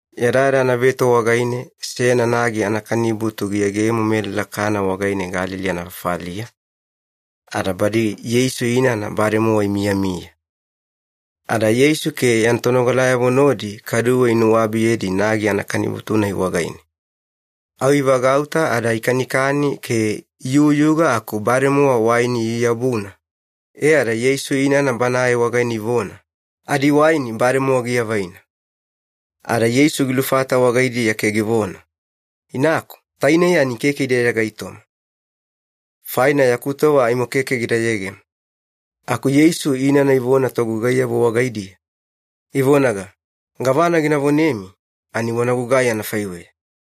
Yadayada anaveto wagaine seyana nagi anakanibutu giyegemo melala Kana wagaine Galili anafafaliya, ada badi Yeisu inana bademowa imiyamiya. Ada Yeisu ke yana tonogalayavo nodi kaduwe inuwabiyedi nagi anaabutu-nai wagaine. Au ivagauta ada ikanikani ke iyuyuga aku bademowa waini iyu-yabuna, e ada Yeisu inana Banae wagaine ivona, “Adiwaini bademowa giavaina.” Ada Yeisu gilufata wagaidiya ke givona, “Inaku, tainei ani keke ide yada gaitoma. Faina yaku tova aimo keke gida yegemo.” Aku Yeisu inana ivona togugaiyavo wagaidiya, ivonaga, “Gavana gina vonemi ani wana gugai anafaiweya.”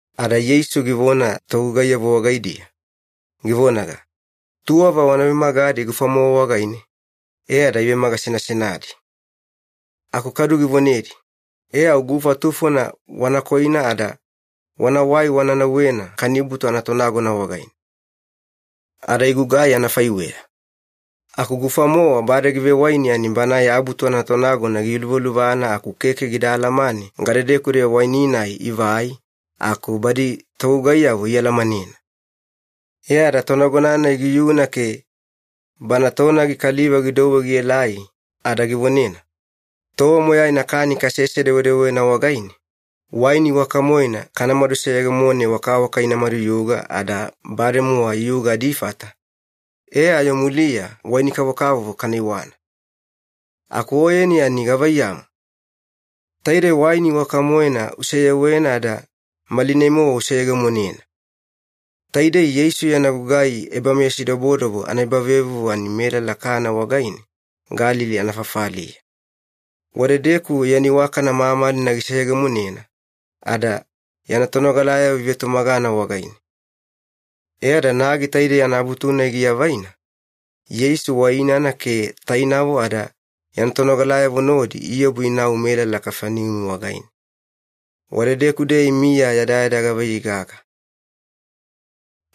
Ada Yeisu givona togugaiyavo wagaidiya, givonaga, “Tuwava wana vemagadi gufa-mowa wagaine,” e ada ivemagasenasenadi. Ada kadu givonedi, “E au gufa tufona wana koina ada wanawai wana nauwena kanibutu anatonagona wagaine.” Ada igugai anafaiweya. Aku gufa-mowa bade givewaini ani banae abutu anatonagona giyuluvaluvana aku keke gida alamane gadedeku-deya waini-nai ivai, aku badi togugaiyavo ialamanena. E ada tonagona-nai giyuna ke bana tonagi kaliva gidouwe gielai ada givonena, “Tova moyaina kani kasese-dewedewena wagaine, waini iwaka-moena kanamadu seyegemone wakawaka ina maduyuga ada bademowa iyuga adifata, e ayo muliya waini kavokavovo kana iwana. Aku oyeni ani gavaiyamu? Taidei waini iwaka-moena useyewena ada malinai-mowa useyegemonena.” Taidei Yeisu yana gugai ebameyasidobodobo anaebavevuvu ani melala Kana wagaine, Galili anafafaliya. Wadedeku yana iwakana mamalina giseyegemonena, ada yana tonogalayavo ivetumagana wagaine. E ada nagi taidei anaabutu-nai giavaina, Yeisu wa inana ke tainavo ada yana tonogalayavo nodi iobu inau melala Kafaneumi wagaine. Wadedeku-deya imiya yadayada gavaiyei gaga.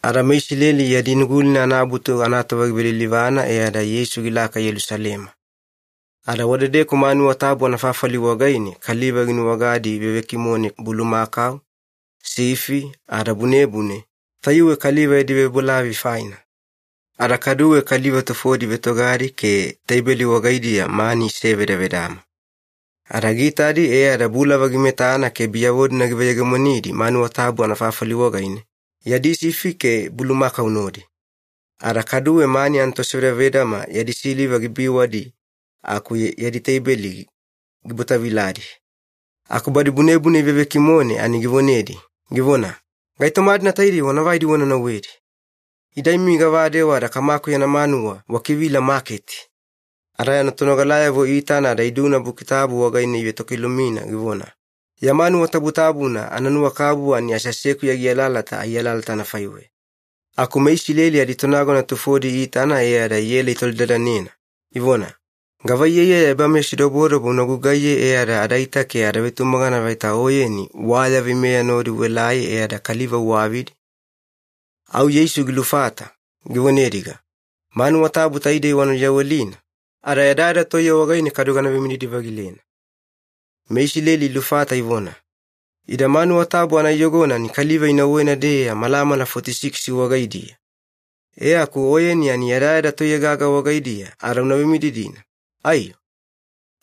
Ada meIsileli yadi Nugulina anaAbutu anatova givelilivana e ada Yeisu gilaka Yelusalema. Ada wadedeku manuwa tabu anafafali wagaine kaliva ginuwagadi ivevekimone bulumakau, sifi, ada bunebune, tayuwe kaliva yadi vebolavoi faina. Ada kaduwe kaliva tufodi ivetogadi ke teibeli wagaidiya mani isevedavedama. Ada giitadi e ada bulava gimetana ke biyavo-dina giveyegemonidi manuwa tabu anafafali wagaine, yadi sifi ke bulumakau nodi. Ada kaduwe mani anatosevedavedama yadi siliva gibiwadi aku yadi teibeli gibwataviladi. Aku badi bunebune ivevekimone ani givonedi, givona, “Gaitoma-dina taidei wana vaidi wana nauwedi! Ida imi gavadewa ada Kamaku yana manuwa wakivila maketi!” Ada yana tonogalayavo iitana ada iduna Buki Tabu wagaine ivetokilumina givona, “Ya manuwa tabutabuna ananuwakabubu ani aseasekuya gialalata ai alalata anafaiweya.” Aku meIsileli aditonagona tufodi iitana e ada iela itolidadanena, ivona, “Gava iyaiyaya ebameyasidobo una gugaiye e ada adaita ke ada vetumagana vaita Oyeni wa ya veimeya nodi uelai e ada kaliva uwavidi?” Au Yeisu gilufata, givonediga, “Manuwa tabu taidei wana luyawelina, ada yadayada toiye wagaine kadu gana vemididi-vagilena.” MeIsileli ilufata ivona, “Ida manuwa tabu anaiyogona ani kaliva inauwena-deya malamala foti-sikisi wagaidiya, e aku Oyeni ani yadayada toiye gaga wagaidiya ada una vemididina, aiyo?”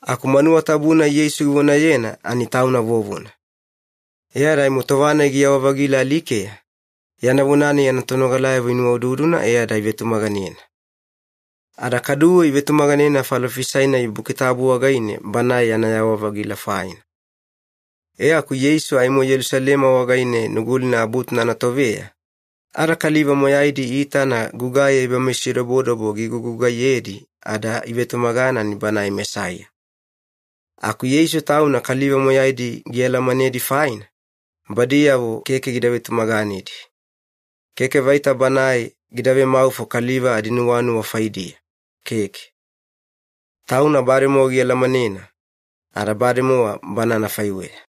Aku manuwa tabu-nai Yeisu givonayena ani Tauna vovona. E ada aimo tova-nai giyawa-vagila alikeya, yana vona-nai yana tonogalayavo inuwaududuna e ada ivetumaganena. Ada kaduwe ivetumaganena falofisai-nai Buki Tabu wagaine Banae yana yawa-vagila faina. E aku Yeisu aimo Yelusalema wagaine Nugulina Abutuna anatoveya, ada kaliva moyaidi iitana gugai ebameyasidobodobo gigugugaiyedi ada ivetumagana ani Banae Mesaiya. Aku Yeisu Tauna kaliva moyaidi gialamanedi faina, badiyavo keke gida vetumaganedi. Keke vaita Banae gida vemaufo kaliva adinuwanuwa faidiya, keke. Tauna bademowa gialamanena, ada bademowa Bana anafaiweya.